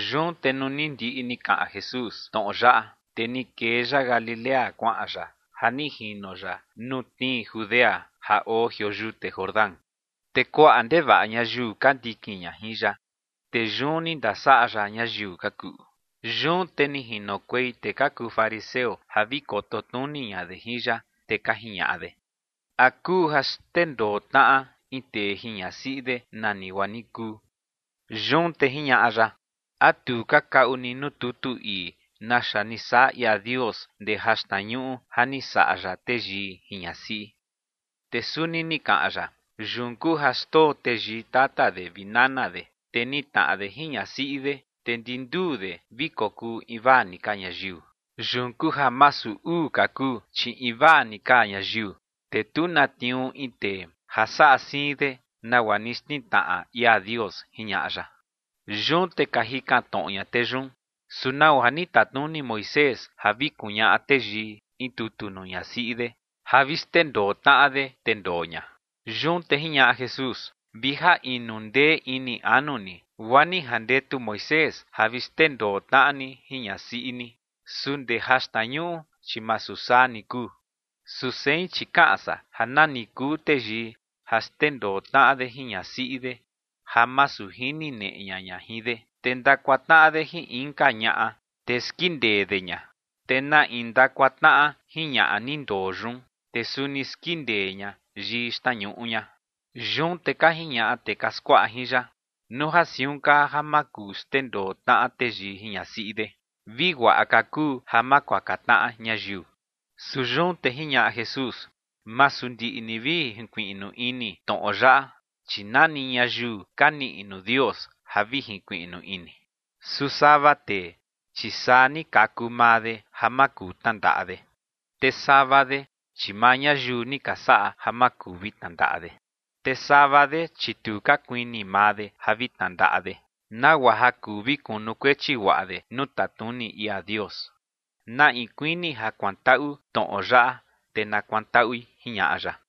Yun te nuu ni ndiꞌi ni kaꞌan Jesús tnoꞌo yaꞌa, te ni kee ya Galilea kuaꞌan ya ja ni jino ya nuu tnii Judea ja oo jioo yute Jordán. Te kuaꞌa ndevaꞌa ñayiu ka ndikin ña jin ya, te yun ni ndasaꞌa ya ñayiu ka kuꞌu. Yun te ni jinokuei tee ka kuu fariseo ja vi koto tnuni ña de jin ya, te ka jiñaꞌa de: ͏―͏¿A kuu ja xndendoo tnaꞌa in tee jin ñasiꞌi de nani guaa ni kuu? Yun te jiñaꞌa ya: ͏―͏¿A tu ka kaꞌu ni nuu tutu ii naxa ni saꞌa ia Dios ndee jaxtnañuꞌu ja ni saꞌa ya teyii jin ñasiꞌi? Te suni ni kaꞌan ya: ͏―͏Yun kuu ja xndoo teyii tata de vi nana de, te nitnaꞌa de jin ñasiꞌi de, te ndi nduu de vi kokuu invaa ni ka ñayiu. Yun kuu ja masu uu ka kuu, chi invaa ni ka ñayiu. Te tu na tniuu in tee ja saꞌa siin de nagua ni xtnitnaꞌa ia Dios ͏―͏jiñaꞌa ya. Yun te ka jikan tnoꞌo ña tee yun: ͏―͏¿Su nau ja ni tatnuni Moisés ja vi kuñaꞌa teyii in tutu nuu ñasiꞌi de ja vi xndendoo tnaꞌa de, te ndoo ña? Yun te jiñaꞌa Jesús: ͏―͏Vi ja inu ndee ini anu ni, guaa ni jandetu Moisés ja vi xndendoo tnaꞌa ni jin ñasiꞌi ni. Su ndee jaxtnañuꞌu, chi masu saa ni kuu. Su sein, chi kaꞌan san ja nani kuu teyii ja xndendoo tnaꞌa de jin ñasiꞌi de ja masu jini neꞌe ña ña jin de, te ndakuaka tnaꞌa de jin inka ñaꞌa, te skindee de ña. Te na in ndakuaka tnaꞌa jin ñaꞌa ni ndoo yun, te suni skindee ña yii xtnañuꞌu ña. Yun te ka jiñaꞌa tee ka skuaꞌa jin ya: ͏―͏Nuu ja siun kaa ja ma kuu xndendoo tnaꞌa teyii jin ñasiꞌi de, vi guaꞌa ka kuu ja ma kuaka tnaꞌa ñayiu. Su yun te jiñaꞌa Jesús: ͏―͏Masu ndiꞌi ni vi jinkuiꞌnu ini tnoꞌo yaꞌa, chi nani ñayiu ka niꞌi nuu Dios ja vi jinkuiꞌnu ini. Su sava tee, chi saa ni kaku maa de ja ma kuu tnandaꞌa de. Te sava de, chi maa ñayiu ni ka saꞌa ja ma kuu vi tnandaꞌa de. Te sava de, chi tu ka kuini maa de ja vi tnandaꞌa de, nagua ja kuu vi kunukuechi guaꞌa de nuu tatnuni ia Dios. Na in kuini ja kuantaꞌu tnoꞌo yaꞌa, te na kuantaꞌui ͏―͏jiñaꞌa ya.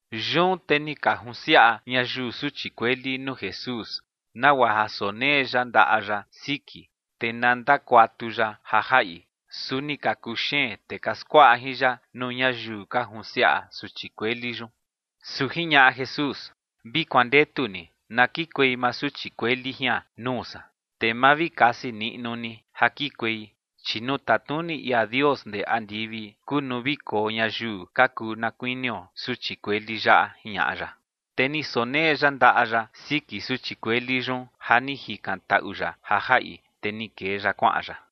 Yun te ni ka junsiaꞌa ñayiu suchi kueli nuu Jesús, nagua ja sonee ya ndaꞌa ya siki, te na ndakuatu ya ja jaꞌi. Su ni ka kuxeen tee ka skuaꞌa jin ya nuu ñayiu ka junsiaꞌa suchi kueli yun. Su jiñaꞌa Jesús: ͏―͏Vi kuandetu ni na kikuei maa suchi kueli jian nuu san, te ma vi kasi niꞌnu ni ja kikuei, chi nuu tatnuni ia Dios ndee andivi kuu nuu vi koo ñayiu ka kuu na kuinio suchi kueli yaꞌa ͏―͏jiñaꞌa ya. Te ni sonee ya ndaꞌa ya siki suchi kueli yun ja ni jikantaꞌu ya ja jaꞌi, te ni kee ya kuaꞌan ya.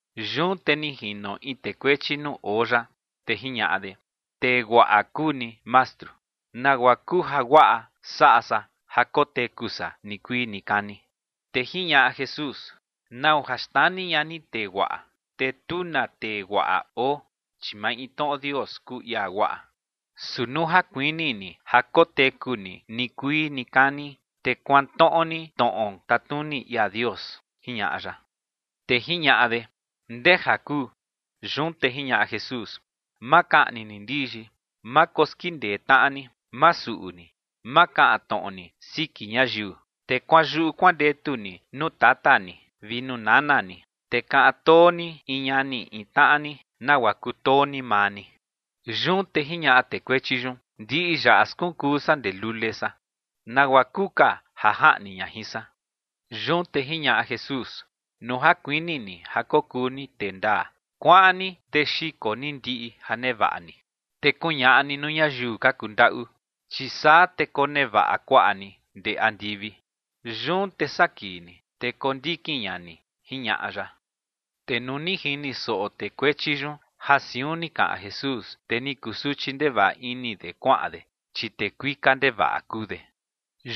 Yun te ni jino in tee kuechi nuu oo ya, te jiñaꞌa de: ͏―͏Tee guaꞌa kuu ni, Mastru. ¿Nagua kuu jaguaꞌa saꞌa san ja koteku san nikuii nikani? Te jiñaꞌa Jesús: ͏―͏¿Nau ja xnani ña ni tee guaꞌa? Te tu na tee guaꞌa oo, chi maintnoꞌo Dios kuu ia guaꞌa. Su nuu ja kuini ni ja koteku ni nikuii nikani, te kuantnoꞌo ni tnoꞌo tatnuni ia Dios ͏―͏jiñaꞌa ya. Te jiñaꞌa de: ͏―͏¿Ndeja kuu? Yun te jiñaꞌa Jesús: ͏―͏Ma kaꞌni ni ndiyi. Ma koskindee tnaꞌa ni. Ma suꞌu ni. Ma kaꞌan tnoꞌo ni siki ñayiu. Te kuanyuꞌu kuandetu ni nuu tata ni vi nuu nana ni, te kaꞌan too ni in ñani in tnaꞌa ni nagua kutoo ni maa ni. Yun te jiñaꞌa tee kuechi yun: ͏―͏Ndiꞌi yaꞌa skunkuu san ndee lule san. ¿Nagua kuu ka ja jaꞌni ña jin san? Yun te jiñaꞌa Jesús: ͏―͏Nuu ja kuini ni ja kokuu ni tee ndaa, kuaꞌan ni te xiko ni ndiꞌi ja nevaꞌa ni, te kuñaꞌa ni nuu ñayiu ka kundaꞌu, chi saa te konevaꞌa kuaꞌa ni ndee andivi. Yun te saa kii ni, te kondikin ña ni ͏―͏jiñaꞌa ya. Te nuu ni jini soꞌo tee kuechi yun ja siun ni kaꞌan Jesús, te ni kusuchi ndevaꞌa ini de kuaꞌan de, chi tee kuika ndevaꞌa kuu de.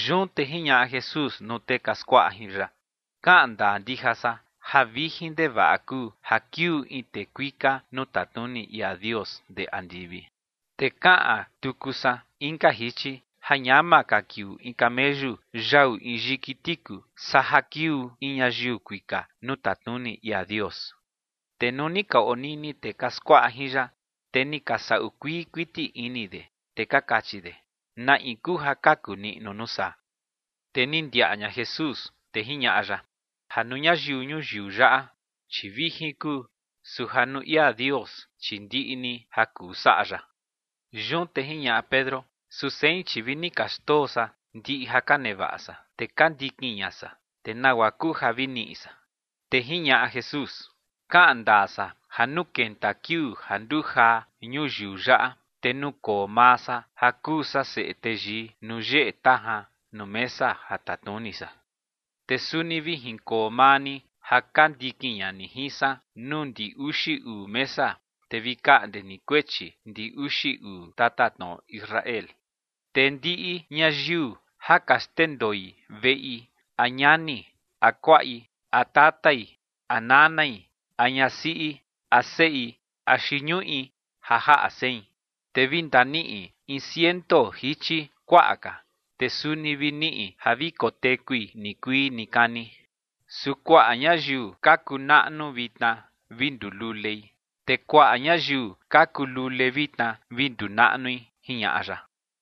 Yun te jiñaꞌa Jesús nuu tee ka skuaꞌa jin ya: ͏―͏Kaꞌan ndaa ndija san ja vijin ndevaꞌa kuu ja kiuu in tee kuika nuu tatnuni ia Dios ndee andivi. Te kaꞌan tuku san inka jichi ja ñama ka kiuu in cameyu yau in yiki tiku, saa ja kiuu in ñayiu kuika nuu tatnuni ia Dios. Te nuu ni ka onini tee ka skuaꞌa jin ya, te ni ka saꞌu kuii kuiti ini de, te ka kachi de: ͏―͏¿Na in kuu ja kaku niꞌnu nuu saa? Te ni ndiaꞌa ña Jesús, te jiñaꞌa ya: ͏―͏Ja nuu ñayiu ñuyiu yaꞌa, chi vijin kuu, su ja nuu ia Dios, chi ndiꞌi ni ja kuu saꞌa ya. Yun te jiñaꞌa Pedro: ͏―͏Su sein, chi vi ni ka xndoo san ndiꞌi ja ka nevaꞌa san, te ka ndikin ña san, te ¿nagua kuu ja vi niꞌi san? Te jiñaꞌa Jesús: ͏―͏Kaꞌan ndaa san ja nuu kenta kiuu ja nduu jaa ñuyiu yaꞌa, te nukoo maa san ja kuu san Seꞌe Teyii nuu yeꞌe tajan nuu mesa ja tatnuni san, te suni vi jinkoo maa ni ja ka ndikin ña ni jin san nuu ndi uxi uu mesa, te vi kaꞌnde ni kuechi ndi uxi uu tatatnoꞌo Israel. Te ndiꞌi ñayiu ja ka xndendoi veꞌi a ñani a kuaꞌi a tatai a nanai a ñasiꞌi a seꞌi axi ñuꞌi ja jaꞌa sein, te vi ndaniꞌi in ciento jichi kuaꞌa ka, te suni vi niꞌi ja vi kotekui nikuii nikani. Su kuaꞌa ñayiu ka kuu naꞌnu vitna vi nduu lulei, te kuaꞌa ñayiu ka kuu lule vitna vi nduu naꞌnui ͏―͏jiñaꞌa ya.